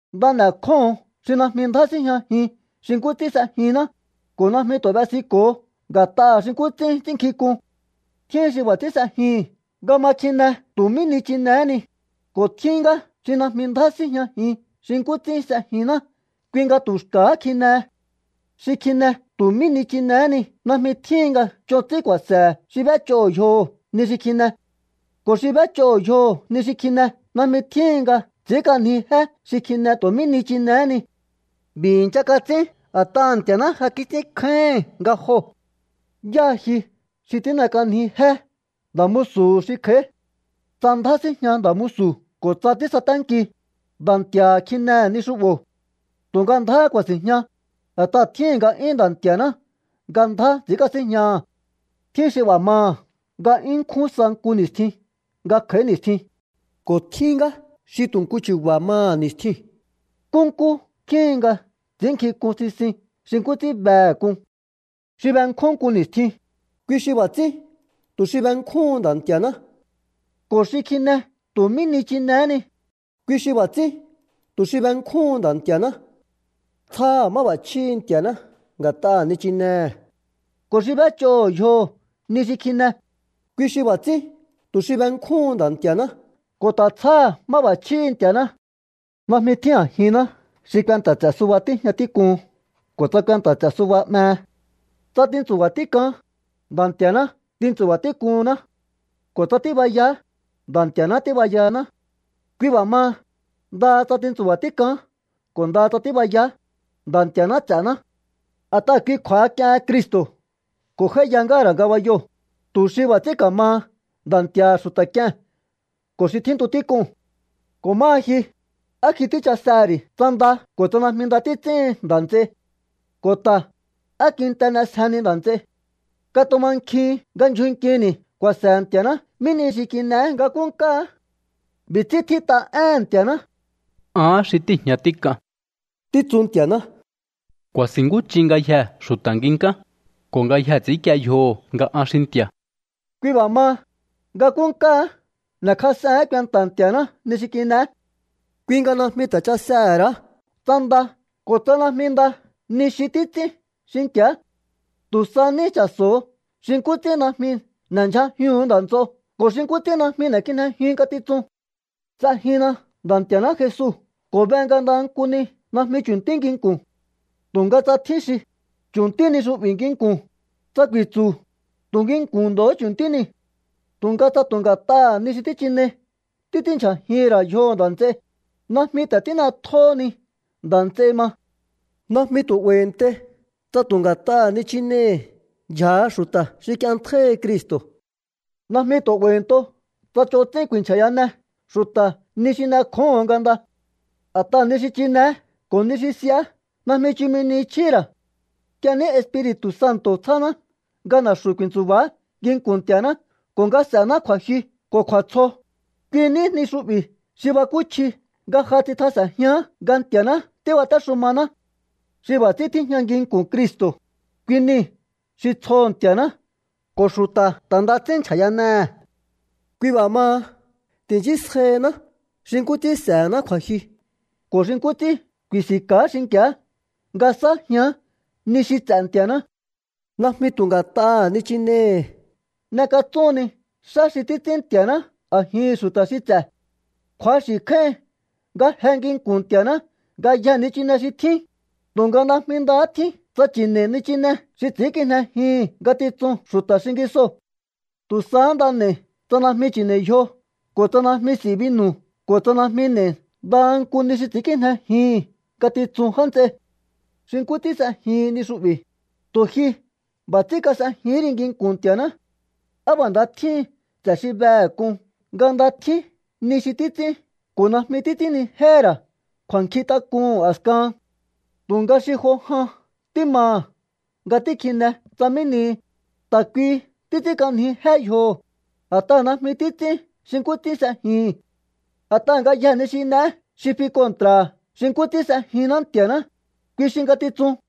Nda n'e̱kjóho̱on xi najmi ndjá síjñajin xi nkú ts'ín s'ejinná, ko̱ najmi tu̱ b'esiko̱o nga̱t'aha̱ xi nkú ts'ín ts'ínnkjink'un. Tjín xi b'a̱ ts'ín s'ejihi̱n nga ma kjine tu̱ mí nichinehé ni, ko̱ tjín ngá xi najmi ndjá síjñajin xi nkú ts'ín s'ejinná kui nga tu̱ xka̱há kjinehe. Xi kjine tu̱ mí nichinehé ni najmi tjíhin nga ch'on ts'ín ku̱a̱se̱he̱ xi b'éch'oho̱ yjoho̱ ni xi kjine. Ko̱ xi b'éch'oho̱ yjoho̱ ni xi kjine najmi tjíhin nga ts'i̱ínk'anji jé xi kjine tu̱ mí nichinehé ni. B'i̱ i̱ncha kats'ín a̱t'aha̱ Nti̱a̱ná ja kits'ínkjáíhi̱n nga joo̱. ¿Yáha ji xi tín'ek'anjihinni jé nda̱ musu̱hu̱ xi kj'a̱í? Tsa ndjá síjña nda̱ musu̱ ko̱ tsa tísaténki, Nda̱ Nti̱a̱ha̱ kjinehe̱ ni xu'bo̱. Tu̱nga ndjáhá ku̱a̱si̱jña, a̱t'aha̱ tjíhi̱n nga'yún Nda̱ Nti̱a̱ná nga ndjá ts'i̱ínkasíjñaha̱. Tjín xi b'a̱ maha̱ nga 'yún nkjún sa nku ni̱stjin nga kj'a̱í ni̱stjin, ko̱ tjín ngá xi tu̱ nku chu̱ba̱ maha̱ ni̱stjiu̱n. Nkúnkú tjíhin nga ts'i̱ínnkjink'un sisin xi nkú ts'ín behe̱ k'un. Xi benkjún nku ni̱stjin, kui xi b'a̱ ts'ín tu̱ xi benkjúhun Nda̱ Nti̱a̱ná. Ko̱ xi kjine tu̱ mí nichinehé ni, kui xi b'a̱ ts'ín tu̱ xi benkjúhun Nda̱ Nti̱a̱ná. Tsjáha̱ máb'a̱chjíhi̱ Nti̱a̱ná nga̱t'aha̱ nichinehe̱. Ko̱ xi b'éch'oho̱ yjoho̱ ni xi kjine, kui xi b'a̱ ts'ín tu̱ xi benkjúhun Nda̱ Nti̱a̱ná ko̱ ta̱ tsjáha̱ máb'a̱chjíhi̱ Nti̱a̱ná. Najmi tjín a̱jinná xi kuenta̱ ts'e̱ suba tíjña tík'uhun ko̱ tsa kuenta̱ ts'e̱ suba 'mehe. Tsa tintsu̱ba̱ tík'aán, Nda̱ Nti̱a̱ná tintsu̱ba̱ tík'uhunná. Ko̱ tsa tíbayaá, Nda̱ Nti̱a̱ná tíbayahaná. Kui b'a̱ maha, ndaha tsa tintsu̱ba̱ tík'aán ko̱ ndaha tsa tíbayaá, Nda̱ Nti̱a̱ná ts'e̱ná. A̱t'aha̱ kui kju̱a̱ha k'iehen Cristo̱ ko̱ j'áíya ngáha̱ ra̱ ngabayoo̱, tu̱ xi b'a̱ ts'ín ka̱maha Nda̱ Nti̱a̱ha̱ xu̱ta̱ k'ie̱n ko̱ xi tjíntu tík'uu̱n. Ko̱ máha ji, ¿á ji tíchasehe̱ ri̱ tsa nda ko̱ tsa najmi nda títs'íhin nda̱ nts'ei? Ko̱ ta̱, ¿á kinte n'esjeheni nda̱ nts'ei? Katumankjihin nga ndyjun nkini̱ ku̱a̱se̱he̱ Nti̱a̱ná mí nihi xi kin'eé nga nkúkáá. B'i̱ ts'ín tjít'a éhe̱n Nti̱a̱ná: Ahán xi tíi̱jña tík'an, títsu Nti̱a̱ná. Ku̱a̱si̱nkúnch'in ngayjee̱ xu̱ta̱ nginkán, ko̱ ngayjee̱ ts'i̱ínkie yjoho̱ nga an xi Nti̱a̱. Kui b'a̱ maha, nga nkúnkáá n'e̱kjas'ehe̱én kuenta̱ Nti̱a̱ná ni xi kin'eé. Kui nga najmi ta̱ chasehe̱ ra̱á tsa nda ko̱ tsa najmi nda ni xi títs'ín xinki̱á. Tu̱ sa ní cha̱so̱o xi nkú ts'ín najmi n'e̱ndyjajihu̱un nda̱ nts'o ko̱ xi nkú ts'ín najmi n'e̱kijnejiun ngatitsun. S'ejinna Nda̱ Nti̱a̱ná Jesu ko̱ be nga ndaha nku ni najmi chu̱ntí nginku̱n. Tu̱nga tsa tjín xi: “Chu̱ntí ni xu'bi̱ nginku̱n”, tsa ku̱i̱tsu̱, tu̱ nginku̱n ndo̱hó chu̱ntí niu̱. Tu̱nga tsa tu̱ nga̱t'aha̱ ni xi tíchinei títs'ínndyjajihi̱n ra̱ yjoho̱ nda̱ nts'ei, najmi ta̱ tín'etjóhoni nda̱ nts'ei ma. Najmi tu̱ 'ba̱i̱ntei tsa tu̱ nga̱t'aha̱ nichinehi̱ ndyja̱ha xu̱ta̱ xi k'ienntjáíhi Cristo̱. Najmi tu̱ 'ba̱i̱nto tsa ch'on ts'ín ku̱i̱nchja̱yane xu̱ta̱ ni xi n'ekjóho̱on nga nda. A̱t'aha̱ ni xi chi̱ne̱é ko̱ ni xi s'i̱á najmi chumi ni chjíhi̱ ra̱. Nk'ie ní Espiri̱tu̱ Santo̱ tsjáná nga na̱xu̱ ku̱i̱ntsu̱ba̱á nginku̱n Nti̱a̱ná ko̱ nga s'e̱ná kju̱a̱jyu ko̱ kju̱a̱tsjo, kui ní ni xu'bi̱ xi bakúchji nga ja tsitjas'e̱njián nga Nti̱a̱ná tíbatéxumaná. Xi b'a̱ ts'ín tíjña nginku̱n Cristo̱, kui nii̱ xi tsjoho̱ Nti̱a̱ná ko̱ xu̱ta̱ ta̱ nda ts'ín nchja̱yanehe̱. Kui b'a̱ maha, ti̱nchísjaihiná xi nkú ts'ín s'e̱hená kju̱a̱jyu ko̱ xi nkú ts'ín ku̱i̱si̱nka̱á xinki̱á nga sa̱ájián ni xi ts'e̱ Nti̱a̱ná. Najmi tu̱ nga̱t'aha̱ nichinehi̱ n'ekatsúhunni xá xi títs'ín Nti̱a̱ná a̱jihi̱n xu̱ta̱ xi ts'e̱. Kju̱axi̱ kjáíhin nga je nginku̱n Nti̱a̱ná ngayjee̱ nichine xi tjín, tu̱nga najmi ndahá tjín tsa chi̱ne̱i̱ nichine xi ts'i̱ínkijnejihi̱n ngatitsun xu̱ta̱ xingisoo̱. Tu̱ sahá nda n'e̱i̱ tsa najmi chi̱ne̱i̱ yjo ko̱ tsa najmi s'i̱ binu̱ ko̱ tsa najmi n'e̱i ndaha nku ni xi ts'i̱ínkijnejihi̱n ngatitsun já nts'ei. Xi nkú ts'ín s'ejihin ni xu'bi̱, tu̱ ji b'a̱ ts'ín kas'ejihín ri nginku̱n Nti̱a̱ná. ¡Á b'a̱ nda tjíhin ts'e̱ xi behe̱ k'un nga nda tjín ni xi títs'ín ko̱ najmi títs'ínnijéhe̱ ra̱ kju̱a̱nkjintak'uhu̱n a̱skahan! Tu̱nga xi jo jan tímaha̱ nga tíkjine tsa mí nihi, ta̱ kuihi títs'ínk'anji jé yjoho, a̱t'aha̱ najmi títs'ín xi nkú ts'ín s'ejihi̱n. A̱t'aha̱ ngayjee̱ ni xi n'eé xi fi kontra̱ xi nkú ts'ín s'ejinná Nti̱a̱ná, kui xi ngatitsun.